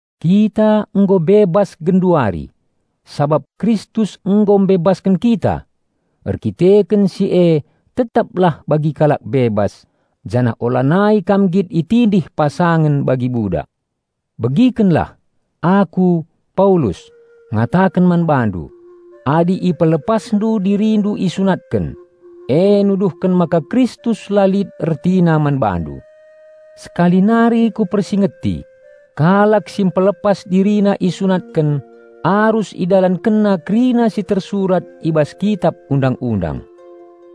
Kita nggo bebas genduari, sabap Kristus nggo mbebasken kita! Erdandanken si e tetaplah bagi kalak bebas, janah ulanai kam nggit itindih pasangen bagi budak. Begikenlah! Aku, Paulus, ngataken man bandu: Adi ipelepasndu dirindu isunatken, e nuduhken maka Kristus la lit ertina man bandu. Sekali nari kupersingeti: Kalak si mpelepas dirina isunatken, arus idalankenna kerina si tersurat i bas Kitap Undang-undang.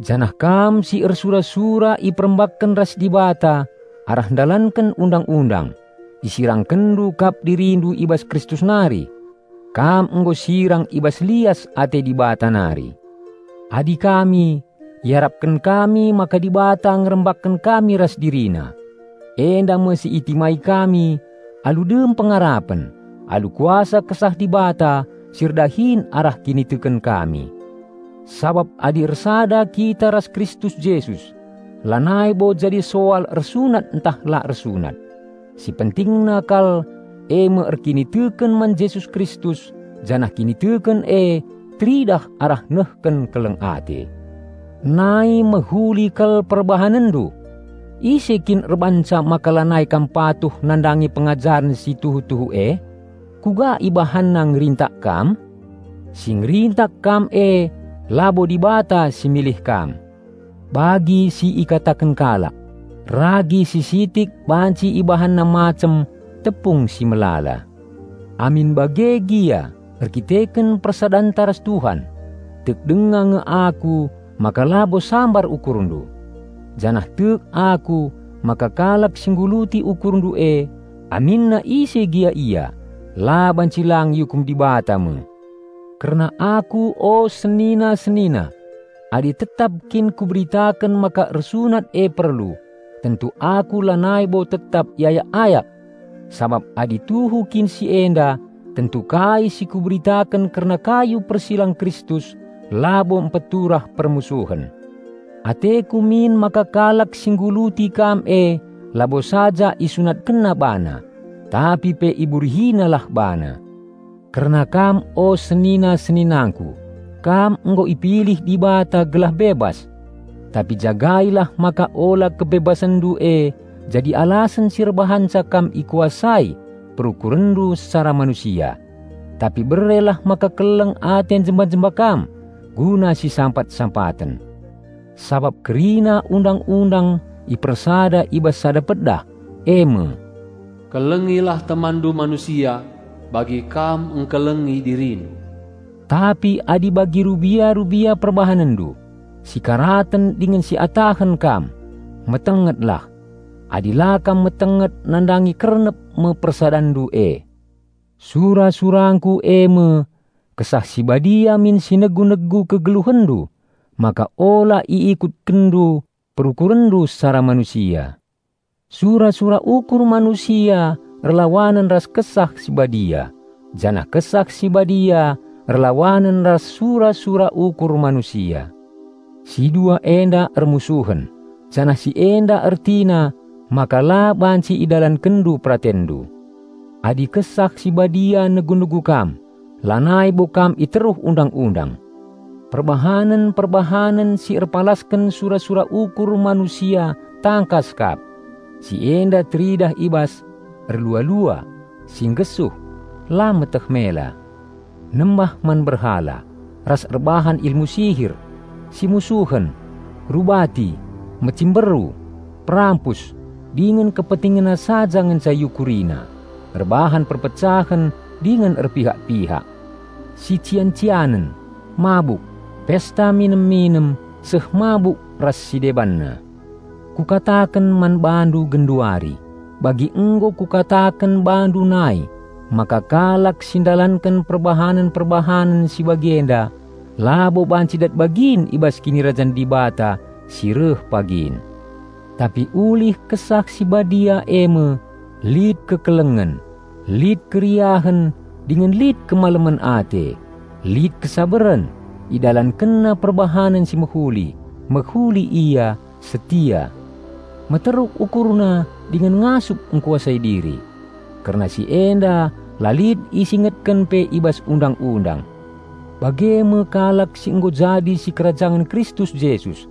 Janah kam si ersura-sura iperembakken ras Dibata arah ndalanken Undang-undang, isirangkenndu kap dirindu i bas Kristus nari. Kam nggo sirang i bas lias ate Dibata nari. Adi kami, iarapken kami maka Dibata ngerembakken kami ras DiriNa. Enda me si itimai kami alu dem pengarapen, alu kuasa Kesah Dibata si erdahin arah kiniteken kami. Sabap adi ersada kita ras Kristus Jesus, lanai bo jadi soal ersunat ntah la ersunat. Si pentingna kal eme erkiniteken man Jesus Kristus janah kiniteken e teridah arah nehken keleng ate. Nai mehuli kal perbahanenndu! Ise kin erbahanca maka lanai kam patuh nandangi pengajaren si tuhu-tuhu e? Kuga ibahanna ngerintak kam? Si ngerintak kam e labo Dibata si milih kam. Bagi si ikataken kalak, "Ragi si sitik banci ibahanna macem tepung si melala." Amin bage gia erdandanken persadanta ras Tuhan, tek denga nge aku maka labo sambar ukurndu, janah tek aku maka kalak si ngguluti ukurndu e, aminna ise gia ia, la banci lang iukum Dibata me. Kerna aku o senina-senina, adi tetap kin kuberitaken maka ersunat e perlu, tentu aku lanai bo tetap iayak-ayak! Sabap adi tuhu kin si enda, tentu kai si kuberitaken kerna kayu persilang Kristus labo mpeturah permusuhen. Ateku min maka kalak si ngguluti kam e labo saja isunatkenna bana, tapi pe iburihinalah bana. Kerna kam o senina-seninangku, kam nggo ipilih Dibata gelah bebas. Tapi jagailah maka ula kebebasenndu e jadi alasen si erbahanca kam ikuasai perukurenndu secara manusia. Tapi berelah maka keleng ate njemba-njemba kam guna si sampat-sampaten. Sabap kerina Undang-undang ipersada i bas sada pedah, eme, "Kelengilah temanndu manusia bagi kam ngkelengi dirindu." Tapi adi bagi rubia-rubia perbahanenndu, si karaten dingen si atahen kam, metengetlah; adi la kam metenget nandangi kernep me persadanndu e. Sura-surangku eme: Kesah Si Badia min si negu-negu kegeluhenndu maka ula iikutkenndu perukurenndu secara manusia. Sura-sura ukur manusia erlawanen ras Kesah Si Badia, janah Kesah Si Badia erlawanen ras sura-sura ukur manusia. Si dua enda ermusuhen, janah si enda ertina maka la banci idalankenndu peratenndu. Adi Kesah Si Badia negu-negu kam lanai bo kam iteruh Undang-undang. Perbahanen-perbahanen si erpalasken sura-sura ukur manusia tangkas kap. Si enda teridah i bas: erlua-lua, si nggesuh, la meteh mela; nembah man berhala ras erbahan ilmu sihir; simusuhen, rubati, mecimberu, perampus dingen kepentingenna saja ngenca iukurina. Erbahan perpecahen dingen erpihak-pihak. Sician-cianen, mabuk, pesta minem-minem seh mabuk ras si debanna. Kukataken man bandu genduari, bagi nggo kukataken bandu nai maka, kalak si ndalanken perbahanen-perbahanen si bagi enda labo banci dat bagin i bas Kinirajan Dibata si reh pagin. Tapi ulih Kesah Si Badia eme: lit kekelengen, lit keriahen dingen lit kemalemen ate, lit kesabaren, idalankenna perbahanen si mehuli, mehuli ia, setia. Meteruk ukurna dingen ngasup engkuasai diri. Kerna si enda la lit isingetken pe i bas Undang-undang. Bage me kalak si nggo jadi sikerajangen Kristus Jesus;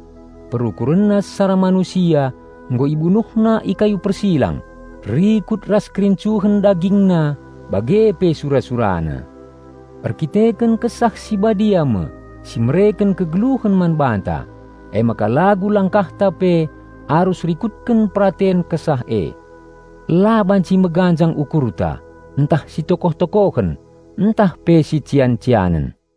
perukurenna secara manusia nggo ibunuhna i kayu persilang rikut ras kerincuhen dagingna bage pe sura-surana. Erkiteken Kesah Si Badia me si mereken kegeluhen man banta, emaka lagu langkahta pe arus rikutken peraten Kesah e. La banci meganjang ukurta, ntah sitokoh-tokohen, ntah pe sician-cianen.